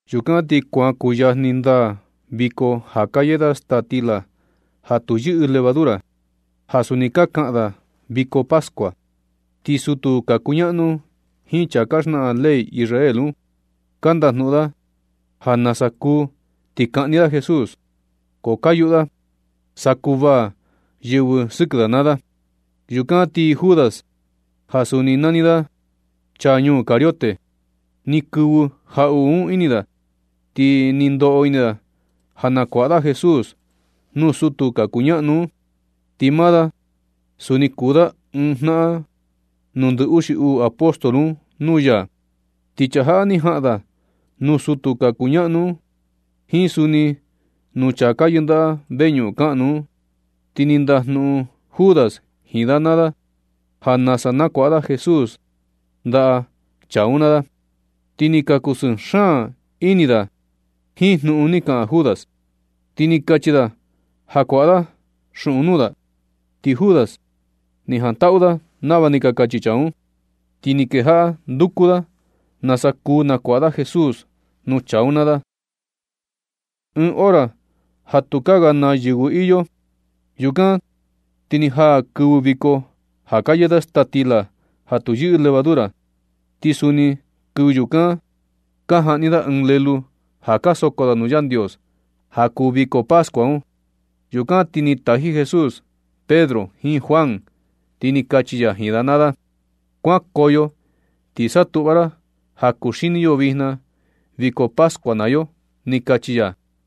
Yukan ti kuan kuyajni ndaa viko ja ka yee da staa stila ja tu yɨꞌɨ levadura, ja suni ka kaꞌan da viko pascua. Ti sutu ka kuñaꞌnu jiin chaa ka xnaꞌan ley Israel un, ka ndajnuꞌun da ja nasa kuu ti kaꞌni da Jesús. Ko ka yuꞌu da sa kuvaa yɨvɨ sɨkɨ da naa da. Yukan ti Judas, ja suni nani da, chaa ñuu Cariote, ni kɨvɨ jaꞌuꞌu un ini da, ti ni ndoꞌo ini da ja nakuaꞌa da Jesús nuu sutu ka kuñaꞌnu un. Ti maa da suni kuu da ɨɨn jnaꞌan nuu ndɨ uxi uu apóstol un nuu ya. Ti chaa jaꞌa ni jaꞌan da nuu sutu ka kuñaꞌnu un jiin suni nuu chaa ka yɨndaꞌa veñuꞌun kaꞌnu un, ti ni ndajnuꞌun Judas jiin da naa da ja nasa nakuaꞌa da Jesús ndaꞌa chaa un naa da. Ti ni ka kusɨɨ xaan ini da jiin jnuꞌun ni kaꞌan Judas, ti ni kachi da ja kuaꞌa da xuꞌun nuu da. Ti Judas ni jantaꞌu da nava ni ka kachi chaa un. Ti ni kejaꞌa nduku da nasa kuu nakuaꞌa da Jesús nuu chaa un naa da, ɨɨn hora ja tu kaa ga naa yɨvɨ iyo. Yukan ti ni jaa kɨvɨ viko ja ka yee da staa stila ja tu yɨꞌɨ levadura. Ti suni kɨvɨ yukan ka jaꞌni da ɨɨn lelu ja ka soko da nuu Yandios ja kuu viko pascua un. Yukan ti ni taji Jesús Pedro jiin Juan, ti ni kachi ya jiin da naa da: ―Kuankoyo ti satuꞌva ra ja kuxini yo vijna viko pascua naa yo ―ni kachi ya.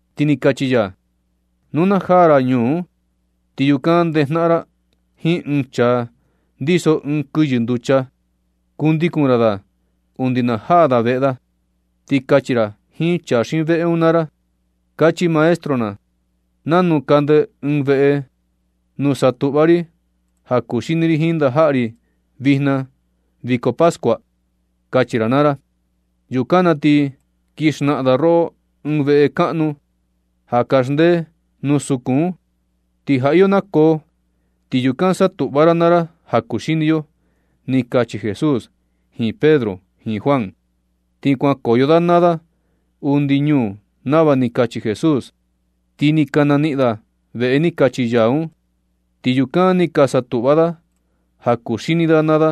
Ti ni kachi ya: ―Nuu na jaa ra ñuu un, ti yukan ndejnaꞌan ra jiin ɨɨn chaa ndiso ɨɨn kɨyɨ nducha. Kundikun ra da undi na najaa da veꞌe da, ti kachi ra jiin chaa xiin veꞌe un naa ra: “Kachi Maestro na: ¿Nanu kande ɨɨn veꞌe nuu satuꞌva ri ja kuxini ri jiin ndajaꞌa ri vijna viko pascua”? kachi ra naa ra. Yukan na ti kin xnaꞌan da roꞌo ɨɨn veꞌe kaꞌnu ja kaxndee nuu sukun un, ti ja iyo nakoo, ti yukan satuꞌva ra naa ra ja kuxini yo ―ni kachi Jesús jiin Pedro jiin Juan. Ti kuankoyo da naa da undi ñuu nava ni kachi Jesús, ti ni ka naniꞌin da veꞌe ni kachi ya un. Ti yukan ni ka satuꞌva da ja kuxini da naa da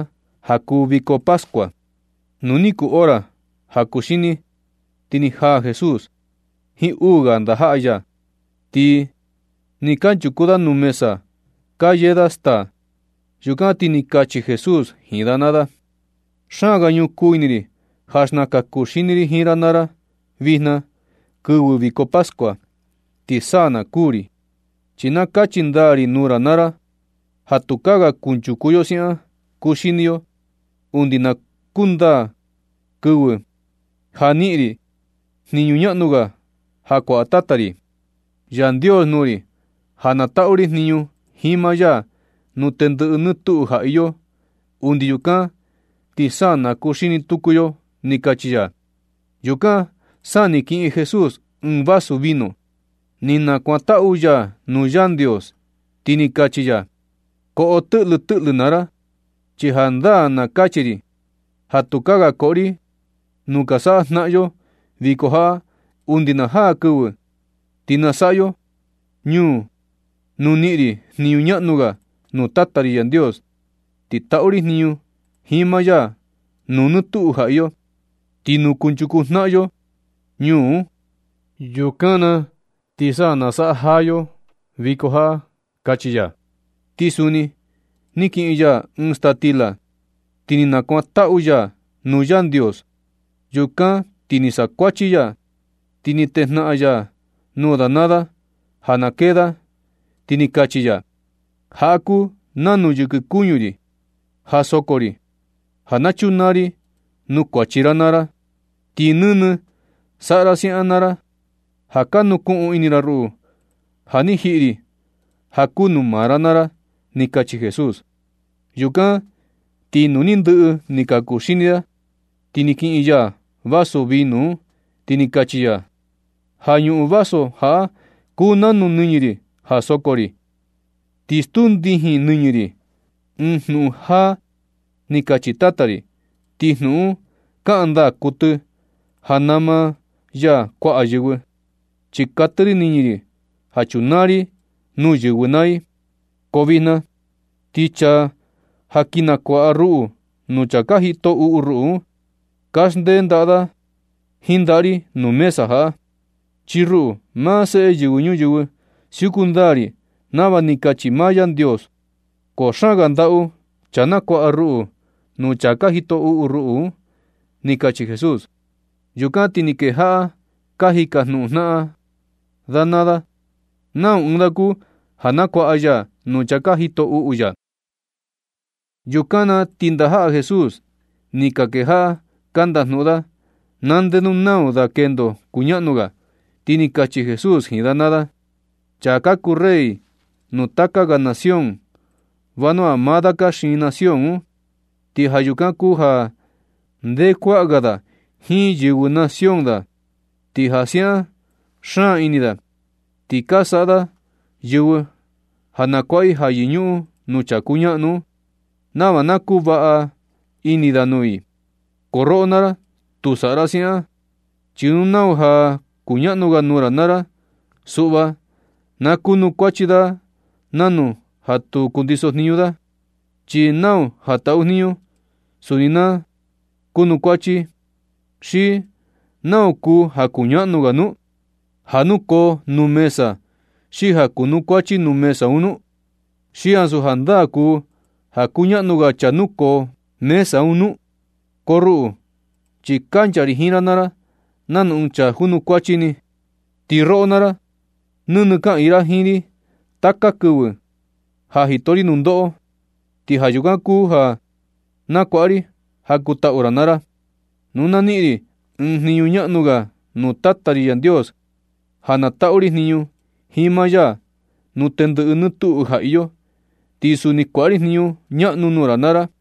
ja kuu viko pascua. Nu ni kuu hora ja kuxini, ti ni jaa Jesús jiin uu ga ndajaꞌa ya, ti nɨ kanchuku da nuu mesa ka yee da staa. Yukan ti ni kachi Jesús jiin da naa da: ―Xaan ga ñukuu ini ri ja xnakan kuxini ri jiin ra naa ra, vijna kɨvɨ viko pascua, ti sa na kuū ri. Chi na kachi ndaa ri nuu ra naa ra ja tukaa ga kunchuku yo siaꞌan kuxini yo undi na kundaa kɨvɨ ja niꞌin ri jniñu ñaꞌnu ga ja kuaꞌa Tata ri Yandios nuu ri, ja na taꞌu ri jniñu jiin maa ya nuu tendɨꞌɨ nɨtuꞌu ja iyo. Undi yukan ti sa na kuxini tuku yo ―ni kachi ya. Yukan sa ni kiꞌin Jesús ɨɨn vasu vino, ni nakuantaꞌu ya nuu Yandios, ti ni kachi ya: ―Koꞌo tɨꞌlɨ tɨꞌlɨ naa ra. Chi jandaa na kachi ri ja tukaa ga koꞌo ri nu ka saꞌa jnaꞌan yo viko jaꞌa, undi na jaa kɨvɨ ti nasaꞌa yo ñuu nuu niꞌin ri jniñu ñaꞌnu ga nuu Tata ri Yandios, ti taꞌu ri jniñu jiin maa ya nuu nɨ tuꞌu ja iyo. Ti nu kunchuku jnaꞌan yo ñuu un, yukan na ti sa nasaꞌa jaa yo viko jaꞌa ―kachi ya. Ti suni ni kiꞌin ya ɨɨn staa stila, ti ni nakuantaꞌu ya nuu Yandios. Yukan na ti ni sakuachi ya, ti ni tejnaꞌan ya nuu da naa da ja na kee da, ti ni kachi ya: ―Jaꞌa kuu nanu yɨkɨ kuñu ri ja soko ri, ja na chunaa ri nuu kuachi ra naa ra. Ti nɨnɨ saꞌa ra siaꞌan naa ra ja ka nukuꞌun ini ra ruꞌu ja ni jiꞌi ri ja kuu nuu maa ra naa ra ―ni kachi Jesús. Yukan ti nu ni ndɨꞌɨ ni ka kuxini da ti ni kiꞌin ya vasu vino un, ti ni kachi ya: ―Ja ñuꞌun vaso jaꞌa kuu nanu nɨñɨ ri ja soko ri. Ti stuu ndijin nɨñɨ ri ɨɨn jnuꞌun jáá ni kachi Tata ri. Ti jnuꞌun un kaꞌan ndaa kuɨtɨ ja nama ya kuaꞌa yɨvɨ, chi katɨ ri nɨñɨ ri ja chunaa ri nuu yɨvɨ naa i. Ko vijna ti chaa ja kin nukuaꞌa ruꞌu nuu chaa ka jito uꞌu ruꞌu un, kaxndee ndaꞌa da jiin ndaꞌa ri nuu mesa jaꞌa. Chi ruꞌu, maa Seꞌe Yɨvɨ Ñuyɨvɨ, siuku ndaa ri nava ni kachi maa Yandios, ko xaan ga ndaꞌu chaa nakuaꞌa ruꞌu nuu chaa ka jito uꞌu ruꞌu ―ni kachi Jesús. Yukan ti ni kejaꞌa ka jikajnuꞌun jnaꞌan da naa da nau ɨɨn da kuu ja nakuaꞌa ya nuu chaa ka jito uꞌu ya. Yukan na ti ndajaꞌa Jesús ni ka kejaꞌa ka ndajnuꞌun da na ndenu nau ɨɨn da kendo kuñaꞌnu ga. Ti ni kachi Jesús jiin da naa da: ―Chaa ka kuu rey nuu taka ga nación, vanua maa da ka xiin nación un, ti ja yukan kuu ja nde kuaꞌan ga da jiin yɨvɨ nación da. Ti jaa siaꞌan xaan ini da, ti ka saꞌa yɨvɨ ja nakuaꞌa i ja yɨñuꞌun nuu chaa kuñaꞌnu un, nava na kuu vaꞌa ini da nuu i. Ko roꞌo naa ra, tu saꞌa ra siaꞌan, chi nuu nau ja kuñaꞌnu ga nuu ra naa ra, suꞌva na kuanukuachi da nanu ja tu ndiso jniñu da, chi nau ja taꞌu jniñu, suni na kuanukuachi. ¿Xi nau kuu ja kuñaꞌnu ga nu? ¿Ja nukoo nuu mesa xi ja kunukuachi nuu mesa un nu? ¿Xi ansu jandaa kuu ja kuñaꞌnu ga chaa nukoo mesa un nu? Ko ruꞌu chi kancha ri jiin ra naa ra nanu ɨɨn chaa junukuachi ni. Ti roꞌo naa ra, nɨnɨ kaꞌiin ra jiin ri taka kɨvɨ ja jito ri nundoꞌo. Ti ja yukan kuu ja na kuaꞌa ri ja kuu taꞌu ra naa ra. Nu na niꞌin ri ɨɨn jniñu ñaꞌnu ga nuu Tata ri Yandios ja na taꞌu ri jniñu jiin maa ya nuu tendɨꞌɨ nɨtuꞌu ja iyo, ti suni kuaꞌa ri jniñu ñaꞌnu nuu ra naa ra.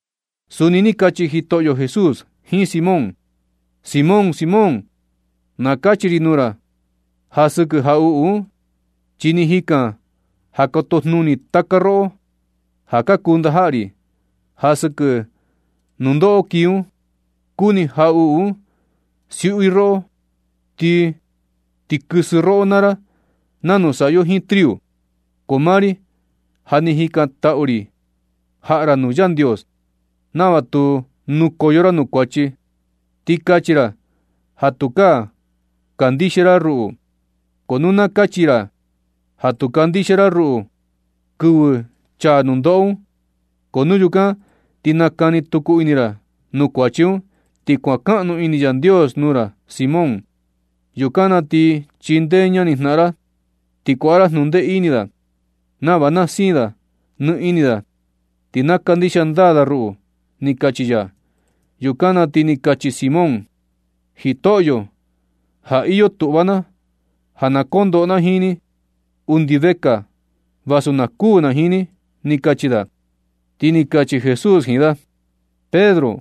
Suni ni kachi Jitoꞌyo Jesús jiin Simón: ―Simón, Simón, na kachi ri nuu ra ja sɨkɨ jaꞌuꞌu un, chi ni jikan ja kotojnuni taka roꞌo ja ka kuu ndajaꞌa ri. Ja sɨkɨ nundoꞌo kii un, kuni jaꞌuꞌu uu siuꞌu roꞌo ti kɨsɨ roꞌo naa ra nanu saꞌa yo jiin triu. Ko maa ri ja ni jikantaꞌu ri jaꞌa ra nuu Yandios nava tu nukoyo ra nuu kuachi, ti kachi ra ja tukaa ka kandixia ra ruꞌu. Ko nu na kachi ra ja tu kandixia ndaa ra ruꞌu kɨvɨ chaa nundoꞌo un, ko nu yukan ti nakani tuku ini ra nuu kuachi un, ti kuankaꞌnu ini Yandios nuu ra, Simón. Yukan na ti chindee ñanijnaꞌan ra ti kuaꞌa ra jnundee ini da, nava na siin nɨ ini da ti na kandixia ndaa da ruꞌu ―ni kachi ya. Yukan na ti ni kachi Simón: ―Jitoꞌyo, ja iyo tuꞌva na ja kondoꞌo na jiin ni undi vekaa vasu na kuū na jiin ni ―ni kachi da. Ti ni kachi Jesús jiin da: ―Pedro,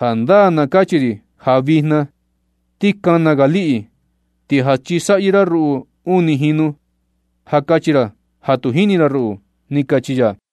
jandaa na kachi ri ja vijna, ti kana ga liꞌi, ti ja chisaꞌyɨ ra ruꞌu uni jinu, ja kachi ra ja tu jini ra ruꞌu ―ni kachi ya.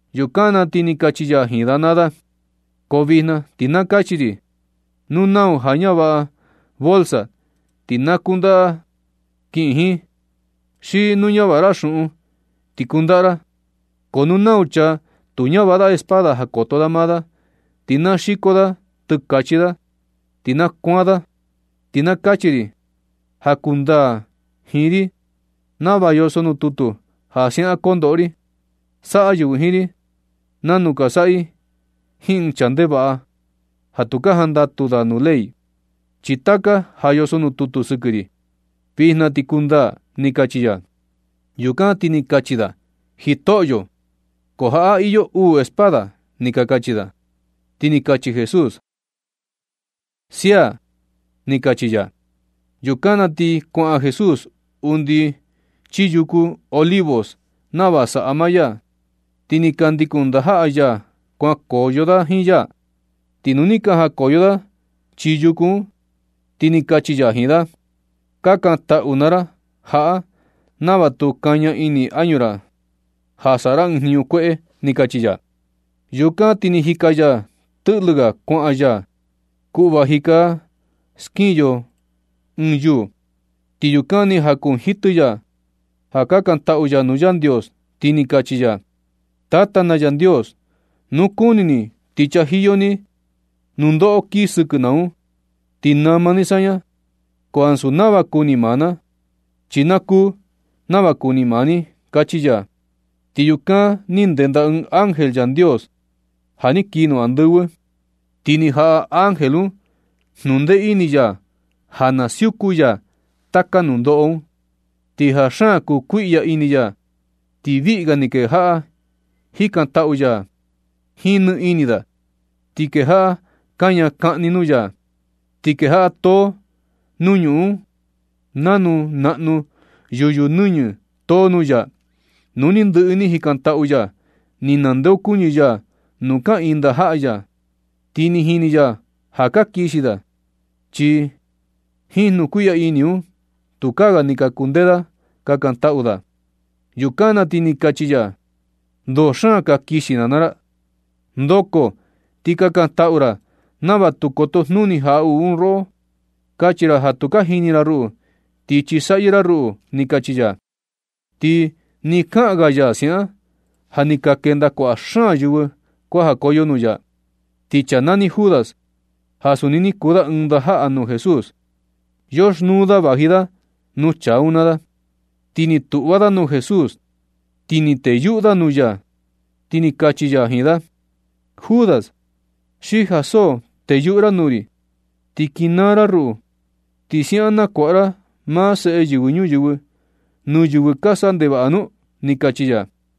Yukan na ti ni kachi ya jiin da naa da: ―Ko vijna ti na kachi ri, nu nau ja ka ñavaꞌa bolsa, ti na kundaꞌa kiꞌin jiin. Xi nu ñavaꞌa ra xuꞌun ti kundaꞌa ra. Ko nu nau chaa tu ñavaꞌa espada ja koto da maa da, ti na xiko da tɨkachi da ti na kuan da. Chi na kachi ri ja kundaa jiin ri nava yoso nuu tutu ja siaꞌan kondoꞌo ri: “Saꞌa yɨvɨ jiin ri nanu ka saꞌa i jiin ɨɨn chaa ndevaꞌa ja tu ka jandatu da nuu ley.” Chi taka ja yoso nuu tutu sɨkɨ ri, vijna ti kundaa ―ni kachi ya. Yukan ti ni ka kachi da: ―Jitoꞌyo, ko jaꞌa iyo uu espada ―ni ka kachi da. Ti ni kachi Jesús: ―Sia ―ni kachi ya. Yukan na ti kuaꞌan Jesús undi chii yuku Olivos nava saꞌa maa ya, ti ni ka ndikun ndajaꞌa ya kuankoyo da jiin ya. Ti nu ni ka jakoyo da chii yuku un, ti ni kachi ya jiin da: ―Kakantaꞌu naa ra jaꞌa nava tu kaña ini añu ra ja saꞌa ra ɨɨn jniñu kueꞌe ―ni kachi ya. Yukan ti ni jika ya tɨꞌlɨ ga kuaꞌan ya, kuꞌva jika skiꞌin yo ɨɨn yuu, ti yukan ni jakunjitɨ ya, ja kakantaꞌu ya nuu Yandios, ti ni kachi ya: ―Tata na Yandios, nu kuni ni ti chajiyo ni nundoꞌo kii sɨkɨ na un, ti nama ni saña, ko ansu nava kuni maa na, chi na kuu nava kuni maa ni ―kachi ya. Ti yukan ni ndenda ɨɨn ángel Yandios ja ni kii nuu andɨvɨ, ti ni jaꞌa ángel un jnundee ini ya ja na siuku ya taka nundoꞌo un. Ti ja xaan kukuiꞌya ini ya, ti viꞌi ga ni kejaꞌa jikantaꞌu ya jiin nɨɨ ini da, ti kejaꞌa kaña kaꞌni nuu ya, ti kejaꞌa too nuu ñuꞌun un, nanu naꞌnu yuyu nɨñɨ too nuu ya. Nu ni ndɨꞌɨ ni jikantaꞌu ya, ni nandeokuñɨ ya nuu kaꞌiin ndajaꞌa ya. Ti ni jini ya ja ka kixi da, chi jiin jnukuiꞌya ini un tukaa ga ni ka kundee da kakantaꞌu da. Yukan na ti ni kachi ya: ―¿Ndo xaan ka kixi ra naa ra? Ndoko ti kakantaꞌu ra nava tu kotojnuni jaꞌuꞌu un roꞌo, kachi ra ja tu ka jini ra ruꞌu, ti chisaꞌyɨ ra ruꞌu ―ni kachi ya. Ti ni kaꞌan ga ya siaꞌan, ja ni ka kenda kuaꞌa xaan yɨvɨ kuajakoyo nuu ya. Ti chaa nani Judas, ja suni ni kuu da ɨɨn ndajaꞌa nuu Jesús, yoxnuu da vaji da nuu chaa un naa da. Ti ni tuꞌva da nuu Jesús, ti ni teyuꞌu da nuu ya. Ti kachi ya jiin da: ―Judas, ¿xi ja so teyuꞌu ra nuu ri ti kinaa ra ruꞌu, ti siaꞌan nakuaꞌa ra maa Seꞌe Yɨvɨ Ñuyɨvɨ nuu yɨvɨ ka saꞌa ndevaꞌa nu? ―ni kachi ya.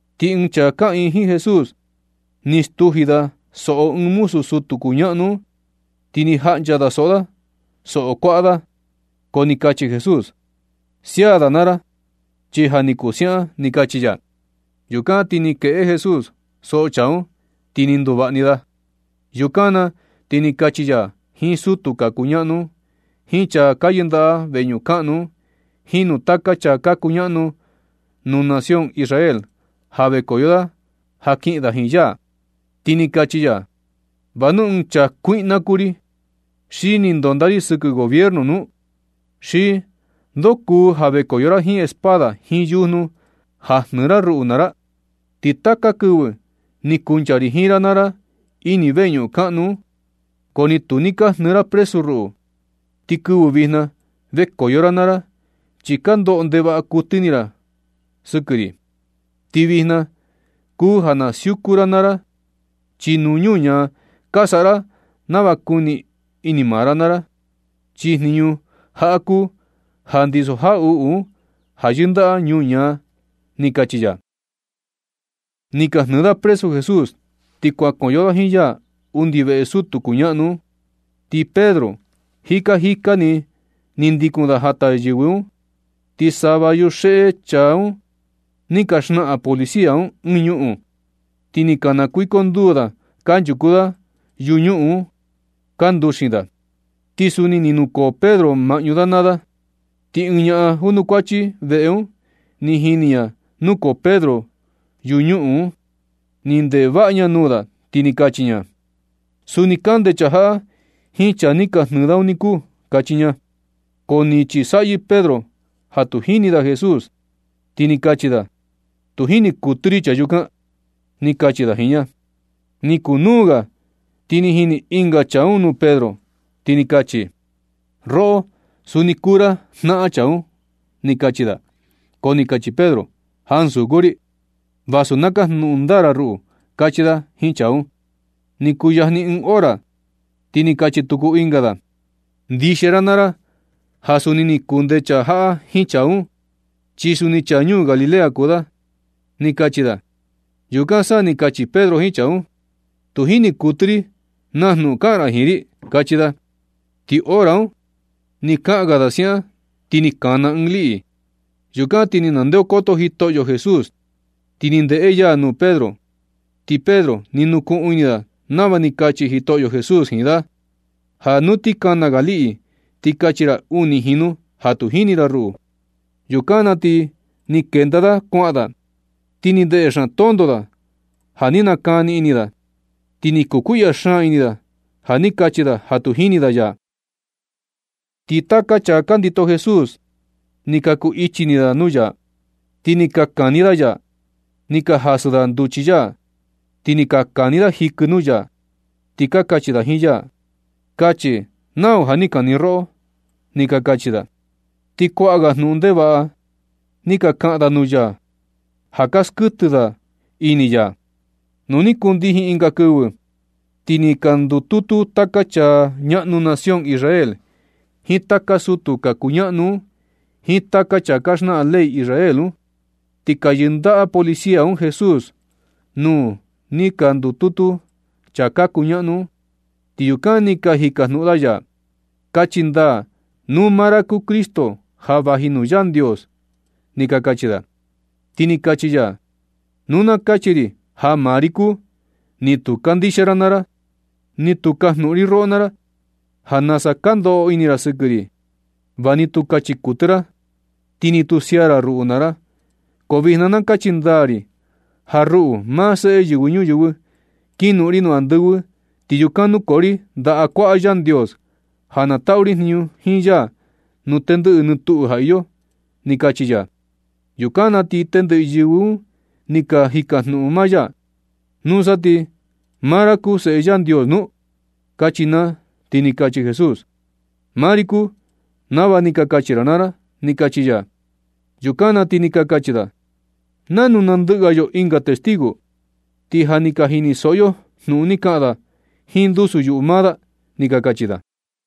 Ti ɨɨn chaa kaꞌiin jiin Jesús ni stuji da soꞌo ɨɨn muzu sutu kuñaꞌnu un, ti ni jaꞌncha da soꞌo da soꞌo kuaꞌa. Ko ni kachi Jesús: ―Sia da naa ra, chi ja ni kuu siaꞌan ni ―ni kachi ya. Yukan ti ni kueꞌe Jesús soꞌo chaa un, ti ni nduvaꞌa ni da. Yukan na ti ni kachi ya jiin sutu ka kuñaꞌnu un, jiin chaa ka yɨndaꞌa veñuꞌun kaꞌnu un, jiin nuu taka chaa ka kuñaꞌnu nación Israel ja vekoyo da ja kiꞌin da jiin ya, ti ni kachi ya: ―¿Va nu ɨɨn chaa kuiꞌna kuu ri, xi ni ndonda ri sɨkɨ gobiernu nu? ¿Xi ndoo kuu ja vekoyo ra jiin espada jiin yujnu ja jnɨɨ ra ruꞌu naa ra? Ti taka kɨvɨ ni kuncha ri jiin ra naa ra ini veñuꞌun kaꞌnu un, ko ni tu ni ka jnɨɨ ra presu ruꞌu. Ti kɨvɨ vijna vekoyo ra naa ra, chi ka ndoꞌo ndevaꞌa kuɨtɨ ini ra sɨkɨ ri. Ti vijna kuu ja na siuku ra naa ra, chi nuu ñuñaa ka saꞌa ra nava kuu ini maa ra na ra. Chi jniñu jaꞌa kuu ja ndiso jaꞌuꞌu un ja yɨndaꞌa ñuñaa ―ni kachi ya. Ni ka jnɨɨ da presu Jesús ti kuankoyo da jiin ya undi veꞌe sutu kuñaꞌnu un, ti Pedro jika jika ni, ni ndikun da jata yɨvɨ un. Ti sava yuxeꞌe chaa un ni ka xnaꞌan policia un ɨɨn ñuꞌun, ti ni ka nakuiconduu da kanchuku da yunuꞌun un ka nduxin da. Ti suni ni nukoo Pedro maꞌñu da naa da. Ti ɨɨn ñaꞌan junukuachi veꞌe un ni jini ña nukoo Pedro yuñuꞌun un. Ni ndeꞌe vaꞌa ña nuu da, ti ni kachi ña: ―Suni kande chaa jaꞌa jiin chaa ni ka jnɨɨ da un niku ―kachi ña. Ko ni chisaꞌyɨ Pedro ja tu jini da Jesús, ti ni kachi da: ―Tu jini kuɨtɨ ri chaa yukan ―ni kachi da jiin ña. Ni kunuu ga, ti ni jini ɨnga chaa un nuu Pedro, ti ni kachi: ―Roꞌo, suni kuu ra jnaꞌan chaa un ―ni kachi da. Ko ni kachi Pedro: ―Ansu kuu ri, vasu na kajnuꞌun ndaa ra ruꞌu ―kachi da jiin chaa un. Ni kuyajni ɨɨn hora, ti ni kachi tuku ɨnga da: ―Ndixia ra naa ra, ja suni ni kunde chaa jaꞌa jiin chaa un, chi suni chaa ñuu Galilea kuu da ―ni kachi da. Yukan sa ni kachi Pedro jiin chaa un: ―Tu jini kuɨtɨ ri naa jnuꞌun kaꞌan ra jiin ri ―kachi da. Ti hora un, nɨ kaꞌan ga da siaꞌan, ti ni kana ɨɨn liꞌi. Yukan ti ni ndeokoto Jitoꞌyo Jesús, ti ni ndeꞌe ya nuu Pedro. Ti Pedro ni nukuꞌun ini da nava ni kachi Jitoꞌyo Jesús jiin da: “Ja nu ti kana ga liꞌi, ti kachi ra uni jinu ja tu jini ra ruꞌu.” Yukan na ti ni kenda da kuaꞌan da, ti ni ndeꞌe xaan tonto da ja ni nakani ini da. Ti ni kukuiꞌya xaan ini da ja ni kachi da ja tu jini da ya. Ti taka chaa ka ndito Jesús, ni ka ku ichi ini da nuu ya, ti ni ka kani da ya. Ni ka jasɨ da nduchi ya, ti ni ka kani da jikɨ nuu ya, ti kachi da jiin ya: ―Kachi nau ja ni kani roꞌo ―ni ka kachi da. Ti kuaꞌa ga jnuꞌun ndevaꞌa ni ka kaꞌan da nuu ya, ja ka skuɨtɨ da ini ya. Nu ni kundijin ɨnga kɨvɨ, ti ni ka ndututu taka chaa ñaꞌnu nación Israel, jiin taka sutu ka kuñaꞌnu un, jiin taka chaa ka xnaꞌan ley Israel un. Ti ka yɨndaꞌa policia un Jesús nuu ni ka ndututu chaa ka kuñaꞌnu un, ti yukan ni ka jikajnuꞌun da ya: ―Kachi ndaa nuu maa ra kuu Cristo ja vaji nuu Yandios ―ni ka kachi da. Ti ni kachi ya: ―Nu na kachi ri ja maa ri kuu, ni tu kandixia ra naa ra. Ti nu kajnuꞌun ri roꞌo naa ra ja nasa ka ndoꞌo ini ra sɨkɨ ri, va ni tu kachi kuɨtɨ ra, ti ni tu sia ra ruꞌu naa ra. Ko vijna na kachi ndaa ri ja ruꞌu, maa seꞌe Yɨvɨ Ñuyɨvɨ, kinoꞌon ri nuu andɨvɨ ti yukan nukoo ri ndaꞌa kuaꞌa Yandios, ja na taꞌu ri jniñu jiin ya nuu tendɨꞌɨ nɨtuꞌu ja iyo ―ni kachi ya. Yukan na ti tendɨꞌɨ yɨvɨ un ni ka jikajnuꞌun maa ya: ―¿Nusa, ti maa ra kuu Seꞌe Yandios nu? ―kachi naa. Ti ni kachi Jesús: ―Maa ri kuu nava ni ka kachi ra naa ra ―ni kachi ya. Yukan na ti ni ka kachi da: ―¿Nanu nandɨꞌɨ ga yo ɨnga testigo? Ti ja ni ka jinisoꞌo yo jnuꞌun ni kaꞌan da jiin ndusu yuꞌu maa da ―ni ka kachi da.